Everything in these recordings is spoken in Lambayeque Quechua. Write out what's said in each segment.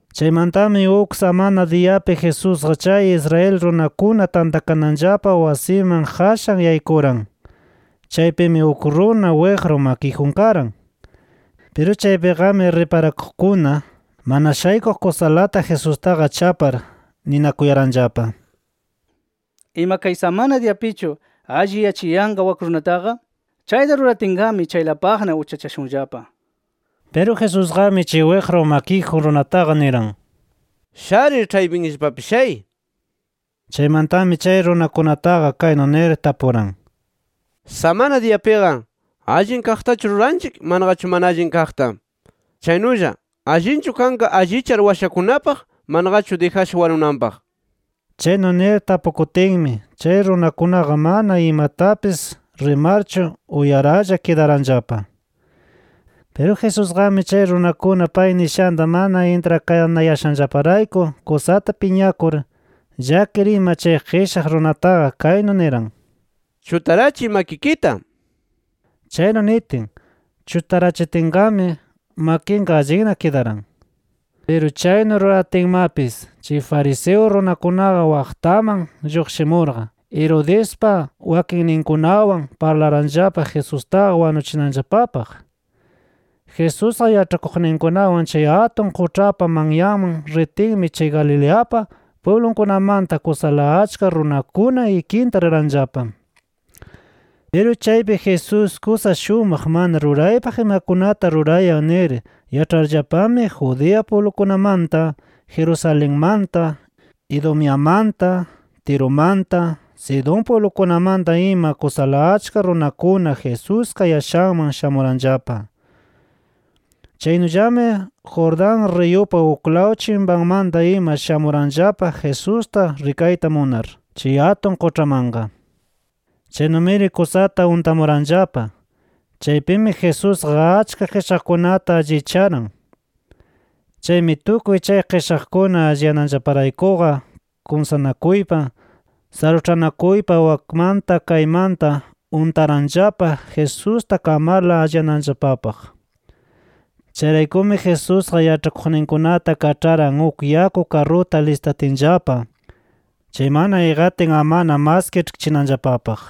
Chaymantami uk samana diyapi Jesusqa chay Israel runakuna tantakananllapa wasiman qashan yaykuran. Chaypimi uk runa wiqru makiyjun karan. Piru chaypiqami riparakuqkuna, mana shaykuq kusalata Jesustaqa chapar, ninakuyaranllapa: “¿Ima kay samana diyapichu alliyachiyanqa wak runataqa? Chayta ruratinqami, chaylapaqna uchachashunllapa” nir. Piru Jesusqami chay wiqru makiyjun runataqa niran: —Sharir, ĉhaypinllapapi shay. Chaymantami chay runakunataqa kaynu nir tapuran: —Samana diyapiqa, ¿allin kaqtachu ruranchik manaqachu mana allin kaqta? Chaynulla ¿allinchu kanqa allichar washakunapaq manaqachu dijasha wanunanpaq? Chaynu nir tapukutinmi, chay runakunaqa mana imatapis rimarchu uyaralla kidaranllapa. Piru Jesusqami chay runakuna pay nishanta mana intrakanayashanllaparayku kusata piñakur, llakir ima chay qishaq runataqa kaynu niran: —Chutarachiy makikita nir. Chaynu nitin, chutarachitinqami makinqa allinna kidaran. Piru chaynu ruratinmapis, chay fariseo runakunaqa waqtaman lluqshimurqa, Herodespa wakinninkunawan parlaranllapa Jesustaqa wanuchinanllapapaq. Jesús yaĉhakuqninkunawan chay atun quĉhapa manyanman ritinmi chay Galileapa pwiblunkunamanta kusala achka runakuna ikinta riranllapa. Piru chaypi Jesús kusa shumaq mana ruraypaq imakunata rurayan nir yaĉharllapami Judea pwiblukunamanta, Jerusalenmanta, Idumeamanta, Tirumanta, Sidón pwiblukunamanta ima kusala achka runakuna Jesús kayashanman shamuranllapa. Chaynullami Jordán riyupa uklaw chimpanmanta ima shamuranllapa Jesusta rikayta munar, chay atun quĉhamanqa. Chaynumiri kusata untamuranllapa. Chaypimi Jesusqa achka qishaqkunata allicharan. Chaymi tukuy chay qishaqkuna alliyananllaparaykuqa kumsanakuypa, saruĉhanakuypa wakmanta kaymanta untaranllapa Jesusta kamarla alliyananllapapaq. Chayraykumi Jesusqa yaĉhakuqninkunata kaĉharan uk yaku karruta listatinllapa, chaymanna iqatin amana mas kiĉhkichinanllapapaq.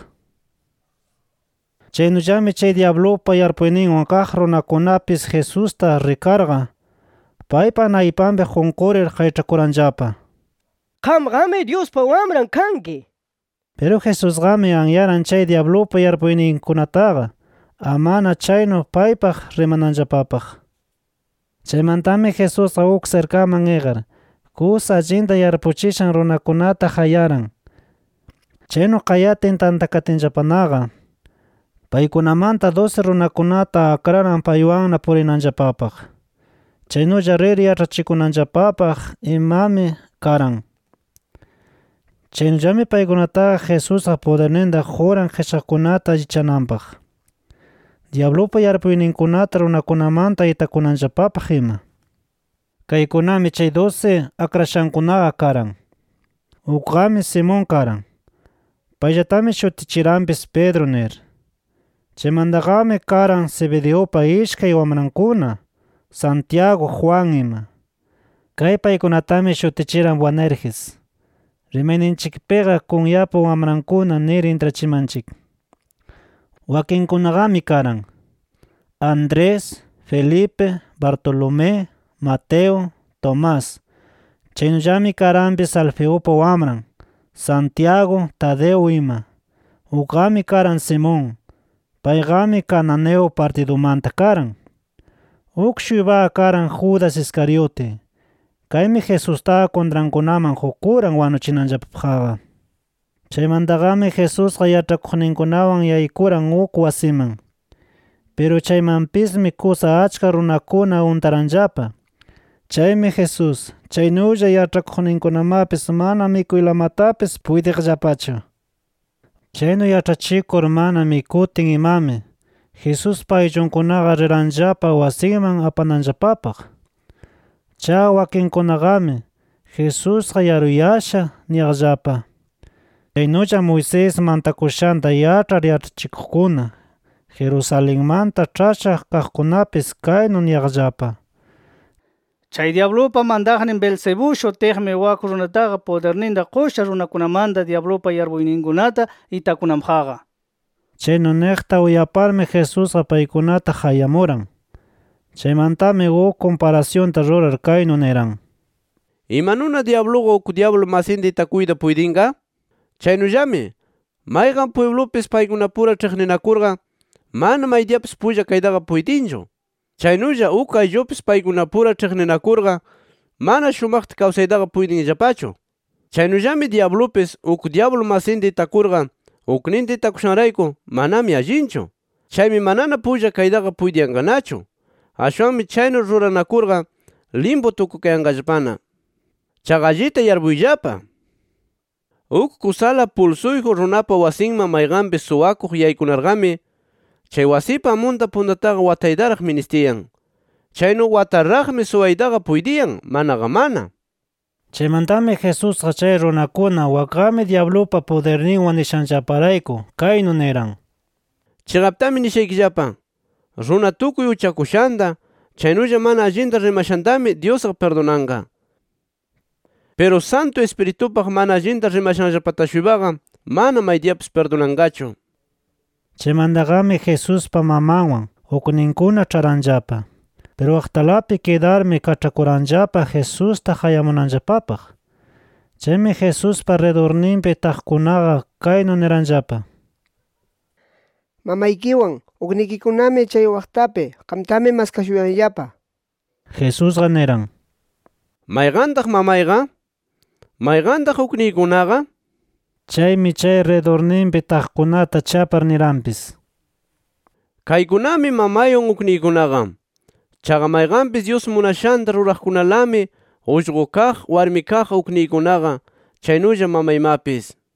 Chaynullami chay dyablupa yarpuyninwan kaq runakunapis Jesusta rikarqa, paypa naypanpi qunqurir, qayĉhakuranllapa: “¡Qamqami Dyuspa Wamran kanki!” nir. Piru Jesusqami anyaran chay dyablupa yarpuyninkunataqa, amana chaynu paypaq rimananllapapaq. Chaymantami Jesusqa uk sirkaman iqar, kusa allinta yarpuchishan runakunata qayaran. Chaynu qayatin tantakatinllapanaqa, paykunamanta dusi runakunata akraran paywanna purinanllapapaq. Chaynulla rir yaĉhachikunanllapapaq imami karan. Chaynullami paykunataqa Jesusqa pudirninta quran qishaqkunata allichananpaq, dyablupa yarpuyninkunata runakunamanta itakunanllapapaq ima. Kaykunami chay dusi akrashankunaqa karan: Ukqami Simón karan. Payllatami shutichiranpis Pedro nir. Chaymantaqami karan Zebedeupa ishkay wamrankuna Santiago, Juan ima. Kay paykunatami shutichiran “Boanerges”. Rimayninchikpiqa “Kunyapa Wamrankuna” nir intrachimanchik. Wakinkunaqami karan: Andrés, Felipe, Bartolomé, Mateo, Tomás. Chaynullami karanpis Alfeupa wamran Santiago, Tadeo ima. Ukqami karan Simón. Payqami Cananeo partidumanta karan. Uk-shuypaqa karan Judas Iscariote. Kaymi Jesustaqa kuntrankunaman qukuran wanuchinanllapapaqqa. Chaymantaqami Jesusqa yaĉhakuqninkunawan yaykuran uk wasiman. Piru chaymanpismi kusa achka runakuna untaranllapa. Chaymi Jesús, chaynulla yaĉhakuqninkunamapis mana mikuylamatapis puytiqllapachu. Chaynu yaĉhachikur mana mikutin imami, Jesuspa ayllunkunaqa riranllapa wasinman apananllapapaq. Chaqa wakinkunaqami “Jesusqa yaruyasha” niyaqllapa. Chaynulla Moisés mantakushanta yaĉhar yaĉhachikuqkuna Jerusalenmanta ĉhasha kaqkunapis kaynu niyaqllapa: “Chay dyablupa mantaqnin Beelzebú shutiqmi, wak runataqa pudirninta qusha runakunamanta dyablupa yarpuyninkunata itakunanpaqqa” nir. Chaynu niqta uyaparmi Jesusqa paykunata qayamuran. Chaymantami uk kumparasyunta rurar kaynu niran: “¿Imanuna dyabluqa uk dyablu masinta itakuyta puytinqa? Chaynullami mayqan pwiblupis paykunapura ĉhiqninakurqa mana maydiyapis pulla kaytaqa puytinchu. Chaynulla uk ayllupis paykunapura ĉhiqninakurqa, mana shumaqta kawsaytaqa puytinllapachu. Chaynullami dyablupis, uk dyablu masinta itakurqa ukninta itakushanrayku manami allinchu. Chaymi manana pulla kaytaqa puytiyanqanachu. Ashwanmi chaynu ruranakurqa limpu tukukayanqallapana. “Chaqa allita yarpuyllapa: Uk kusala pulsuyjun runapa wasinman mayqanpis suwakuq yaykunarqami, chay wasipa amunta puntataqa wataytaraq ministiyan. Chaynu wataraqmi suwaytaqa puytiyan, manaqa mana”. Chaymantami Jesusqa chay runakuna wakqami dyablupa pudirninwan nishanllaparayku, kaynu niran: “Chiqaptami nishaykillapa: Runa tukuy uchakushanta chaynulla mana allinta rimashantami Dyusqa pirdunanqa. Piru Santu Ispiritupaq mana allinta rimashanllapata-shuypaqa mana maydiyapis pirdunanqachu”. Chaymantaqami Jesuspa mamanwan, ukninkuna ĉharanllapa. Piru waqtalapi kidarmi kaĉhakuranllapa Jesusta qayamunanllapapaq. Chaymi Jesuspa ridurninpi taqkunaqa kaynu niranllapa: —Mamaykiwan, uknikikunami chay waqtapi. Qamtami maskashuyanllapa nir. Jesusqa niran: —¿Mayqantaq mamayqa? ¿Mayqantaq ukniykunaqa? Chaymi chay ridurninpi taqkunata chapar niranpis: —Kaykunami mamaywan, ukniykunaqa. Chaqa mayqanpis Dyus munashanta ruraqkunalami ullqu kaq, warmi kaq ukniykunaqa, chaynulla mamaymapis nir.